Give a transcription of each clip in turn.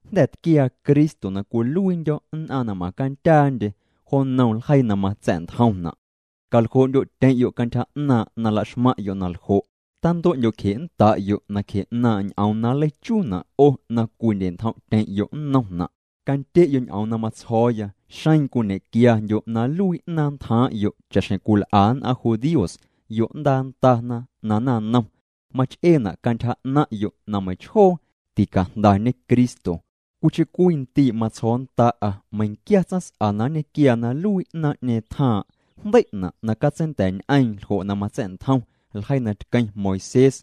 Jnda̱ tquiaa Cristo na cwiluiindyo̱ nn'aⁿ na m'aⁿ candyaandye jo nnom ljeii na matsa̱'ntjomna'. Caljoo'ndyo'tyeⁿ'yo' cantyja 'naaⁿ' na laxmaⁿ'yo' naljo', tantue'ndyo'cje'nnda'yo' nacje 'naaⁿ' ñ'oom na nleichuuna' 'o na cwindye'ntjom'tyeⁿ'yo' nnomna'. Candye'yo' ñ'oom na matsjo̱o̱ya, xeⁿ cwiñequiandyo' na nluii 'naaⁿ ntjaaⁿ'yo' cha'xjeⁿ cwil'a nn'aⁿ judíos yo'ndaa ndana na naⁿnom, mach'eena' cantyja 'naⁿ'yo' na meiⁿchjoo ticajndañe Cristo. Cwiicheⁿ cwii ndii' matsjo̱o̱nnda'a meiⁿquiaa tsaⁿs'a na nñequiaa na nluii 'naaⁿ'ñeeⁿ tjaaⁿ' jndei'na' na catseinda̱a̱'ñ'eeⁿ ljo' na matsa̱'ntjom ljeii na tqueⁿ Moisés.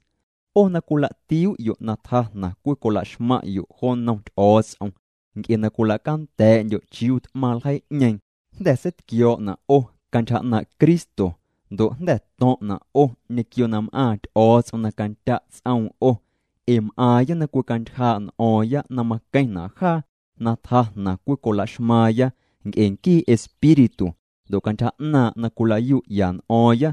'O na cwila'tiuu'yo' na tjaa jnaⁿ cwicola'xmaⁿ'yo' jo nnom Ty'o̱o̱ts'om nc'e na cwila'canda̱a̱'ndyo' chiuu t'maⁿ ljeii'ñeeⁿ jnda̱ seitquio̱o̱'na' 'o cantyja 'naaⁿ' Cristo. Ndo' jnda̱ to̱ⁿ'na' 'o ñequio na m'aaⁿ Ty'o̱o̱ts'om na candya' ts'oom 'o. Ee m'aaⁿya na cwicantyjaa' n'o̱o̱ⁿya na maqueⁿna' jaa na tjaa jnaⁿ cwicola'xmaaⁿya nc'e nquii Espíritu ndo' cantyja 'naaⁿ' na cwila'yu'ya n'o̱o̱ⁿya.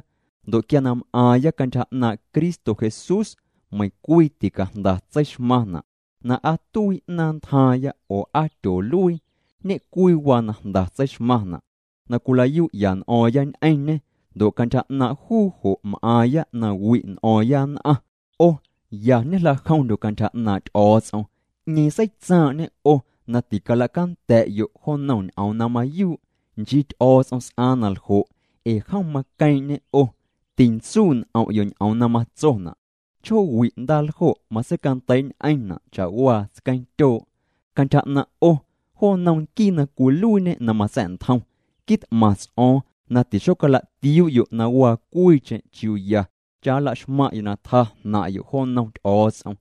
Ndo' quia na m'aaⁿya cantyja 'naaⁿ' Cristo Jesús, meiⁿ cwii ticajnda tseixmaⁿna' na aa tuii 'naaⁿ ntjaaⁿya oo aa tyooluii. Ñe'cwii waa na jnda tseixmaⁿna', na cwila'yu'ya n'o̱o̱ⁿya ñ'eⁿñê ndo' cantyja 'naaⁿ' juu jo' m'aaⁿya na wi' n'o̱o̱ⁿya nn'aⁿ. 'O ya ñejla'jomndyo' cantyja 'naaⁿ' Ty'o̱o̱ts'om. ¿'Ñeeⁿ seitsaaⁿ'ñe 'o na ticala'canda̱'yo' jo nnom ñ'oom na mayuu'? Nchii Ty'o̱o̱ts'om s'aaⁿ naljo' ee jom maqueeⁿ'ñê 'o. Tintsuu' n'om'yo' ñ'oom na matsona': “Chjoowi' ndaaljo' matseicandeii'ñ'eⁿna' cha'waa tsqueeⁿtyoo'.” Cantyja 'naⁿ' 'o, jo nnom nquii na cwiluiiñe na matsa̱'ntjom, quit'maⁿ ts'o̱o̱ⁿ na tixocala'tiuu'yo' na waa cwiicheⁿ chiuu ya cha nla'xmaⁿ'yo' na tjaa jnaⁿ'yo' jo nnom Ty'o̱o̱ts'om.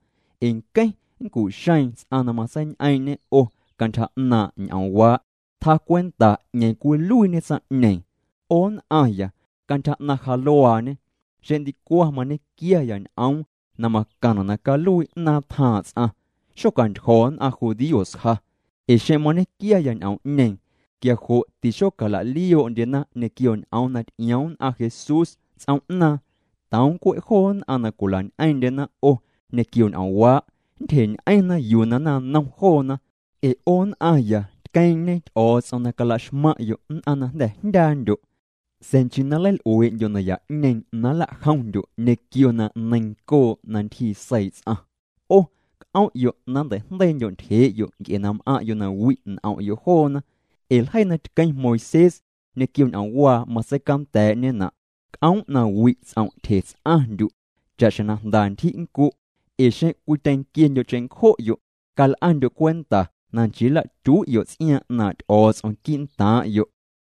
Ee nqueⁿ nncu'xeeⁿ ts'aⁿ na matseiñ'eeⁿ'ñe 'o cantyja 'naaⁿ' ñ'oomwaa', tjacwenta 'ñeeⁿ cwiluiiñe tsaⁿ'ñeeⁿ. 'O nn'aⁿya, cantyja 'naⁿ ja luaañe, xeⁿ ndicwaⁿ mañequiaya ñ'oom na macaⁿna' na caluii 'naaⁿ tjaaⁿ' ts'aⁿ, xocantyjo̱ nn'aⁿ judíos ja. Ee xeⁿ mañequiaya ñ'oom'ñeeⁿ, quia jo' tixocala'lioo'ndyena ñequio ñ'oom na ty'ioom nn'aⁿ Jesús ts'oom'naaⁿ. Toom cwe' joo nn'aⁿ na cwila'ñ'eeⁿ'ndyena 'o ñequio ñ'oomwaa' nntyjeñ'eⁿna yuu na naⁿnom joona. Ee 'o nn'aⁿya tqueeⁿ'ñe Ty'o̱o̱ts'om na cala'xmaⁿ'yo' nn'aⁿ na jnda̱ jndyaandyo'. Sa̱a̱ nchii na nleil'uee'ndyo' naya'ñeeⁿ na nla'jomndyo' ñequio na neiⁿncoo' na ntyjii seii' ts'aⁿ. 'O c'om'yo' na nnteijndeiindyo' ntyjee'yo' nc'e na m'aⁿ'yo' na wi' n'om'yo' joona. Ee ljeii na tqueⁿ Moisés ñequio ñ'oomwaa matseicanda̱a̱'ñena': “C'oom' na wi' ts'om' tyje ts'aⁿndyu' cha'xjeⁿ na jnda ntyji' nncu'.” Ee xeⁿ cwityeⁿnquiendyo' cheⁿncjo'yo', cal'andyo' cwenta na nchii nla'tyui'yo' ts'iaaⁿ 'naaⁿ' Ty'o̱o̱ts'om quii'ntaaⁿ'yo'.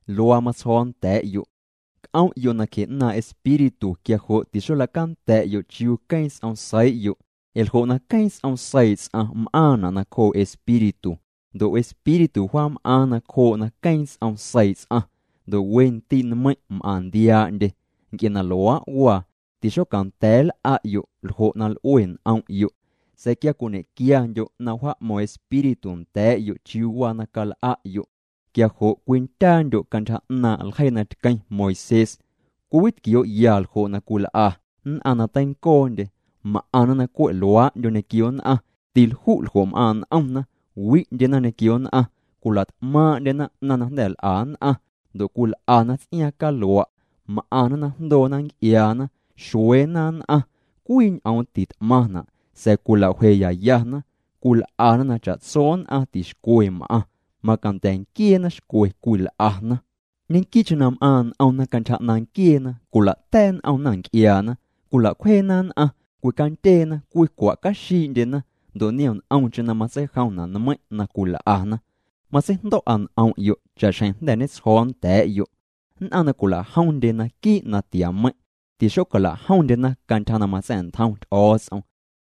Luaa matsjo̱o̱ nda̱a̱'yo': C'om'yo' nacje 'naaⁿ' Espíritu quia jo' tixola'canda̱'yo' chiuu queeⁿ ts'om seii'yo'. Ee ljo' na queeⁿ ts'om seii' ts'aⁿ m'aaⁿna' nacjoo' Espíritu, ndo' Espíritu wjaam'aaⁿ nacjoo' na queeⁿ ts'om seii' ts'aⁿ. Ndo' we ndii' nmeiⁿ' m'aⁿ ndiaa'ndye. Nc'e na luaa' waa, tixocanda̱a̱ nl'a'yo' ljo' na l'ue n'om'yo'. Sa̱a̱ quia cwiñe'quiandyo' na wjaa'mo̱ⁿ Espíritu nda̱a̱'yo' chiuu waa na cal'a'yo', quia jo' cwindyaandyo' cantyja 'naaⁿ' ljeii na tqueⁿ Moisés. Cwiwitquioo'ya ljo' na cwil'a nn'aⁿ na teincoondye: m'aⁿna na cwe' luaa'ndyo ñequio nn'aⁿ, tilju' ljo' m'aaⁿ' n'omna, wi'ndyena ñequio nn'aⁿ, cwila't'maaⁿ'ndyena 'naⁿ na jnda̱ l'a nn'aⁿ, ndo' cwil'ana ts'iaaⁿ calua', m'aⁿna na jndoona nc'iaana, xueena nn'aⁿ. Cwii ñ'oom tit'maⁿna', sa̱a̱ cwilawjeyayana, cwil'ana na cha'tso nn'aⁿ tixcwe m'aⁿ, manda̱ nquieena xcwe cwil'ana. Ñequii'cheⁿ na m'aaⁿ' n'omna cantyja 'naaⁿ nquieena, cwila'ta̱a̱' n'omna nc'iaana, cwila'cwjeena nn'aⁿ, cwicandyeena, cwicwa'caxii'ndyena, ndo' niom nt'omcheⁿ na matseijomna' nmeiⁿ' na cwil'ana. Matseijndo̱'a n'om'yo' cha'xjeⁿ jnda̱ ñetsjo̱o̱ nda̱a̱'yo', nn'aⁿ na cwila'jomndye naquii' natiameiⁿ', tixocala'jomndyena cantyja na matsa̱'ntjom Ty'o̱o̱ts'om.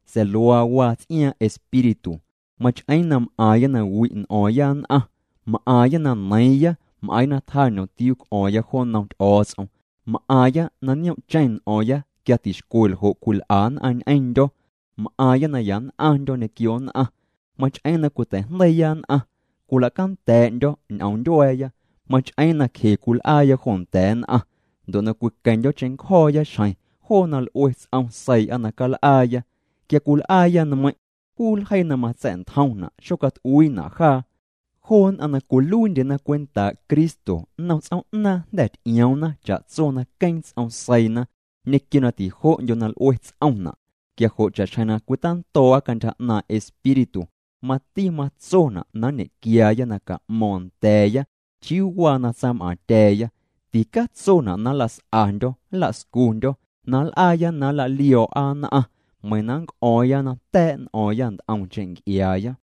Sa̱a̱ luaa waa ts'iaaⁿ' Espíritu: mach'eeⁿ na m'aaⁿya na wi' n'o̱o̱ⁿya nn'aⁿ, m'aaⁿya na neiiⁿya, m'aaⁿya na tjaa ñomtiuu c'o̱o̱ⁿya jo nnom Ty'o̱o̱ts'om, m'aaⁿya na nioom'cheⁿ n'o̱o̱ⁿya quia tixcwe ljo' cwil'a nn'aⁿ ñ'eⁿndyo̱, m'aaⁿya na ya nn'aⁿndyo̱ ñequio nn'aⁿ, mach'eeⁿ na cwiteijndeiiya nn'aⁿ, cwila'canda̱a̱'ndyo̱ ñ'oom ntyua̱a̱ya, mach'eeⁿ na cje cwil'aaya jo nda̱a̱ nn'aⁿ, ndo' na cwiqueⁿndyo̱ cheⁿncjo̱o̱ya xjeⁿ joo na l'ue ts'om seii'a na cal'aaya. Quia cwil'aaya nmeiⁿ' juu ljeii na matsa̱'ntjomna' xocat'uiina' jaa. Joo nn'aⁿ na cwiluiindyena cwentaa' Cristo, nnom ts'oom'naaⁿ jnda̱ ty'ioomna cha'tso na queeⁿ ts'om seiina ñequio na tijo'ndyo na l'ue ts'omna'. Quia jo' cha'xjeⁿ na cwitando̱o̱'a cantyja 'naaⁿ' Espíritu, mati matsona' na nñequiaaya na ca'mo̱o̱ⁿ nda̱a̱ya chiuu waa na tsam'aaⁿtya̱a̱ya. Ticatsona' na nla's'andyo̱ nla'scundyo̱ na nl'aaya na nla'lio̱o̱'a nn'aⁿ, meiⁿ na nnc'o̱o̱ⁿya na ta̱a̱' n'o̱o̱ⁿya nt'omcheⁿ nc'iaaya.